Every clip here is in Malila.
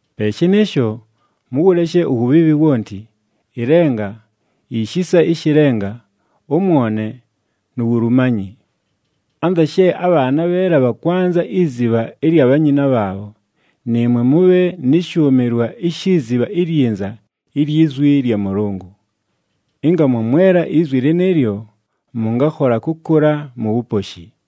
Pe shɨnɨɨsho, mʉwʉleshe uwubhiibhi wonti, ɨlenga, ishisa ɨshɨ lenga, ʉmwone, nu wulumanyi. Anza she abhaana abheela bhakwanza izibha ɨlya bhanyina bhaabho, nɨɨmwe mʉbhe nɨ shʉʉmɨlwa ishi zibha ilyinza ilyi zwi lya Mʉlʉngʉ. Ɨnga mwamwela izwi lɨnɨɨlyo, mʉngakhola kʉkʉla mu wuposhi.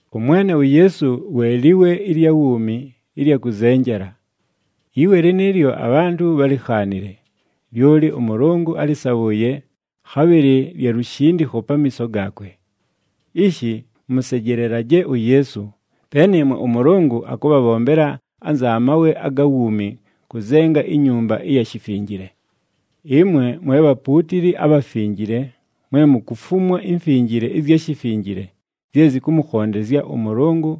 ɄMwene uYeesu we liwe ɨlya wuumi ɨlya kʉzenjela. Iwe lɨnɨɨlyo abhantʉ bhálikhaanile, lyoli ʉMʉlʉngʉ álɨsabhʉʉye, khabhɨlɨ lya lushindikho pamiiso gaakwe. Ishi mʉsejelelaje uYeesu, pe nɨɨmwe ʉMʉlʉngʉ akʉbhabhombela anza mawe aga wuumi kʉzenga inyumba ɨya shifinjile. Ɨmwe mwe bhapuutili abhafinjile mwe mukufumwa imfinjile ɨzya shifinjile zye zɨkʉmʉkhondezya ʉMʉlʉngʉ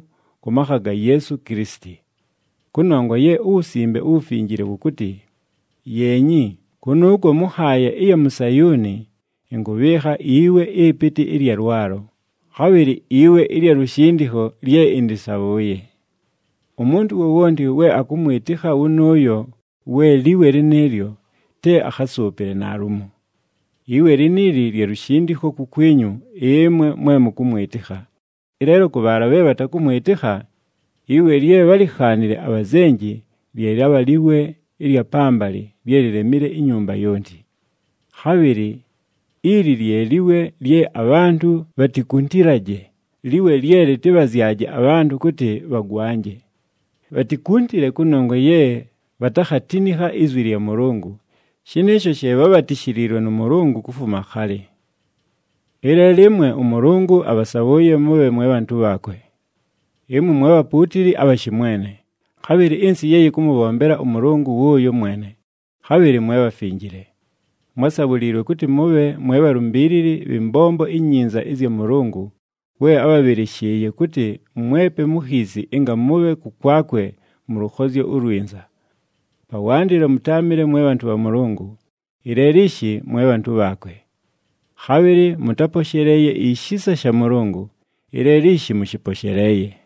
kʉ makha ga Yeesu Kilisiti. Kʉnongwa ye uWusimbe uWufinjile wʉkʉtɨ, “Yeenyi, kʉnʉʉkwo mʉ nhaaya ɨya mu Sayuuni, ɨnkʉbhɨɨkha iwe ɨpɨtɨ ɨlya lwalo, khabhɨlɨ iwe ɨlya lushindikho lye ɨndɨsabhʉʉye. Umuntu wowonti we akʉmwɨtɨkha wʉnʉʉyo we liwe lɨnɨɨlyo, te akhasʉʉpɨle naalumo!” Iwe liniili lya lushindikho kukwinyu ɨmwe mwe mʉkʉmwɨtɨkha, ɨleelo kʉ bhaala bhe bhatakʉmwɨtɨkha, “Iwe lye bhálikhaanile abhazenji, lye lyabha liwe ɨlya pambalɨ lye lilemile inyumba yonti.” Khabhɨlɨ, “Ili lye liwe lye abhantʉ bhatikuntilaje, liwe lye lɨtɨbhazyaje abhantʉ kʉtɨ bhagwanje.” Bhatikuntile kʉnongwa ye bhatakhatinikha izwi lya Mʉlʉngʉ, shɨnɨɨsho she bhabhatishiliilwe nʉ Mʉlʉngʉ kufuma khalɨ. Ɨleelo ɨmwe ʉMʉlʉngʉ abhasabhʉʉye mʉbhe mwe bhantʉ bhaakwe. Ɨmwe mwe bhapuutili abha shɨmwene, khabhɨlɨ ɨnsɨ ye yɨkʉmʉbhombela ʉMʉlʉngʉ wʉʉyo mwene, khabhɨlɨ mwe bhafinjile. Mwásabhuliilwe kʉtɨ mʉbhe mwe bhalumbiilili bhɨ mbombo inyinza ɨzya Mʉlʉngʉ, we ábhabhɨlɨshɨɨye kʉtɨ mwepe mu khiisi ɨnga mʉbhe kʉkwakwe mʉ lʉkhozyo ulwinza. Pawandɨlo mʉtáamɨle mwe bhantʉ bha Mʉlʉngʉ, ɨleelo ishi mwe bhantʉ bhaakwe. Khabhɨlɨ mʉtáposheleeye ishisa sha Mʉlʉngʉ, ɨleelo ishi mʉshɨposheleeye.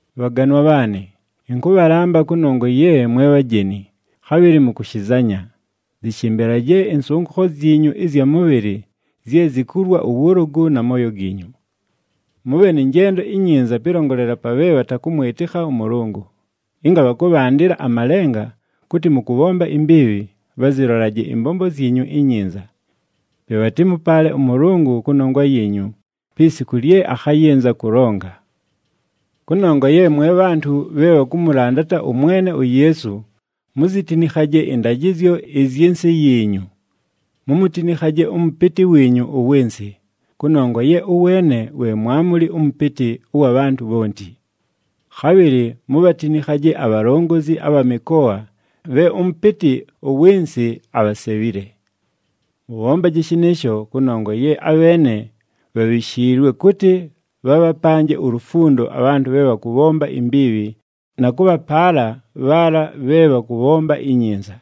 Bhaganwa bhaanɨ, ɨnkʉbhalamba, kʉnongwa ye mwe bhajeni, khabhɨlɨ mukushizanya, zɨshɨmbɨlaje ɨnsʉngʉkho zyinyu ɨzya mʉbhɨlɨ zye zikulwa ʉwʉlʉgʉ na mooyo giinyu. Mʉbhe nɨ njendo inyinza pɨlongolela pa bhe bhatakʉmwɨtɨkha ʉMʉlʉngʉ, ɨnga bhakʉbhandɨla amalenga kʉtɨ mʉkʉbhomba imbiibhi, bhazɨlolaje ɨmbombo zyinyu inyinza. Pe bhatɨmʉpaale ʉMʉlʉngʉ kʉnongwa yiinyu pi siku lye akhayɨnza kʉlonga. Kʉnongwa ye mwe bhantʉ bhe bhakʉmʉlandata ʉMwene uYeesu muzitinikhaje ɨndajɨzyo ɨzyɨ nsɨ yiinyu. Mumutinikhaje ʉmʉpɨtɨ wiinyu ʉwɨ nsɨ, kʉnongwa ye ʉweene we mwamuli ʉmʉpɨtɨ ʉwa bhantʉ bhonti. Khabhɨlɨ mubhatinikhaje abhalongozi abha mɨkoa bhe ʉmʉpɨtɨ ʉwɨ nsɨ abhasebhile. Mʉbhombaje shɨnɨɨsho kʉnongwa ye abheene bhabhishiilwe kʉtɨ bhabhapanje ulufundo abhantʉ bhe bhakʉbhomba imbiibhi na kʉbhapaala bhaala bhe bhakʉbhomba inyinza.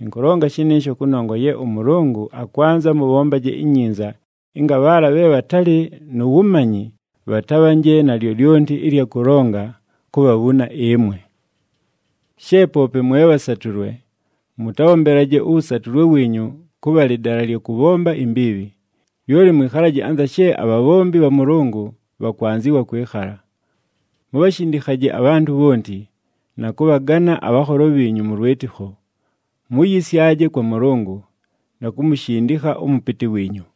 Ɨnkʉlonga shɨnɨɨsho kʉnongwa ye ʉMʉlʉngʉ akwanza mʉbhombaje inyinza ɨnga bhaala bhe bhatalɨ nu wumanyi bhatabhanje na lyolyonti ɨlya kʉlonga kubhabhuna ɨmwe. She poope mwe bhasatʉlwe, mʉtabhombelaje ʉwʉsatʉlwe wiinyu kʉbha lɨdala lya kʉbhomba imbiibhi, lyoli mwɨkhalaje anza she abhabhombi bha Mʉlʉngʉ bhakwanzɨwa kwɨkhala. Mubhashindikhaje abhantʉ bhonti, na kʉbhagana abhanholo bhiinyu mʉ lwɨtɨkho. Muyisyaje kwa Mʉlʉngʉ, na kumushindikha ʉmʉpɨtɨ wiinyu.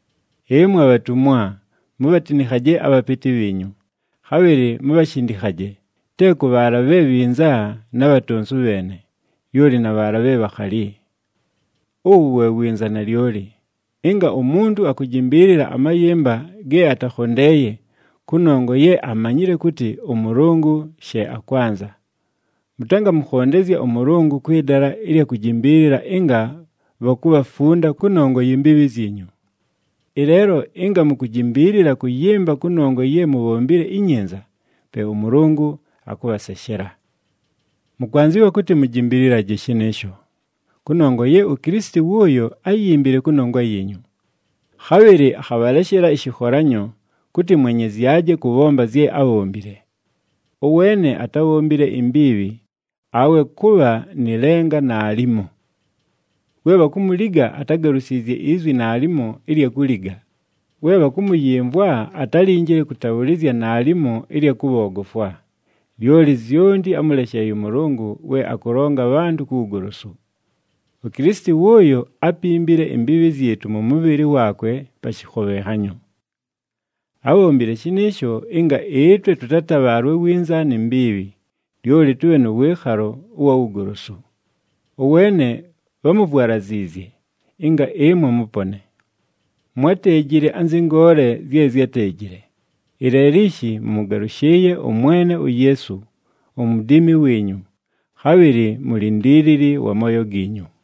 Ɨmwe bhatumwa, mubhatinikhaje abhapɨtɨ bhiinyu, khabhɨlɨ mubhashindikhaje, te kʉ bhaala bhe bhinza na bhatonsu bheene, lyoli na bhaala bhe bhakhali. Uwu we winza nalyoli, ɨnga umuntu akujimbiilila amayɨmba ge atakhondeeye kʉnongwa ye amanyile kʉtɨ ʉMʉlʉngʉ she akwanza. Mʉtangamʉkhondezya ʉMʉlʉngʉ kwɨ dala ɨlya kujimbiilila ɨnga bhakubhafunda kʉnongwa yi mbiibhi zyinyu. Ɨleelo ɨnga mukujimbiilila kʉyɨmba kʉnongwa ye mubhombile inyinza, pe ʉMʉlʉngʉ akʉbhaseshela. Mʉkwanzɨwa kʉtɨ mujimbililaje shɨnɨɨsho, kʉnongwa ye uKilisiti wʉʉyo áyimbile kʉnongwa yiinyu. Khabhɨlɨ akhabhaleshela ɨshɨkholanyo, kʉtɨ mwenyezyaje kʉbhomba zye ábhombile. “Ʉweene atábhombile imbiibhi, awe kʉbha nɨ lenga naalimo.” We bhakumuliga atágalusiizye izwi naalimo ɨlya kuliga, we bhakʉmʉyɨmvwa atálinjile kʉtabhʉlɨzya naalimo ɨlya kʉbhoogofwa, lyoli zyonti ámʉlesheeye ʉMʉlʉngʉ we akʉlonga abhantʉ ku wugolosu. UKilisiti wʉʉyo ápimbile imbiibhi zyɨtʉ mʉ mʉbhɨlɨ waakwe pa shɨkhobhenhanyo. Ábhombile shɨnɨɨsho ɨnga ɨtwe tʉtatabhaalwe winza ni mbiibhi, lyoli tʉbhe nʉ wɨɨkhalo ʉwa wugolosu. Ʉweene bhámuvwalaziizye, ɨnga ɨmwe mʉpone. Mwáteejile anzɨ ngoole zye zyáteejile, ɨleelo ishi mʉmʉgalʉshɨɨye ʉMwene uYeesu, uMudiimi wiinyu, khabhɨlɨ Mulindiilili wa mooyo giinyu.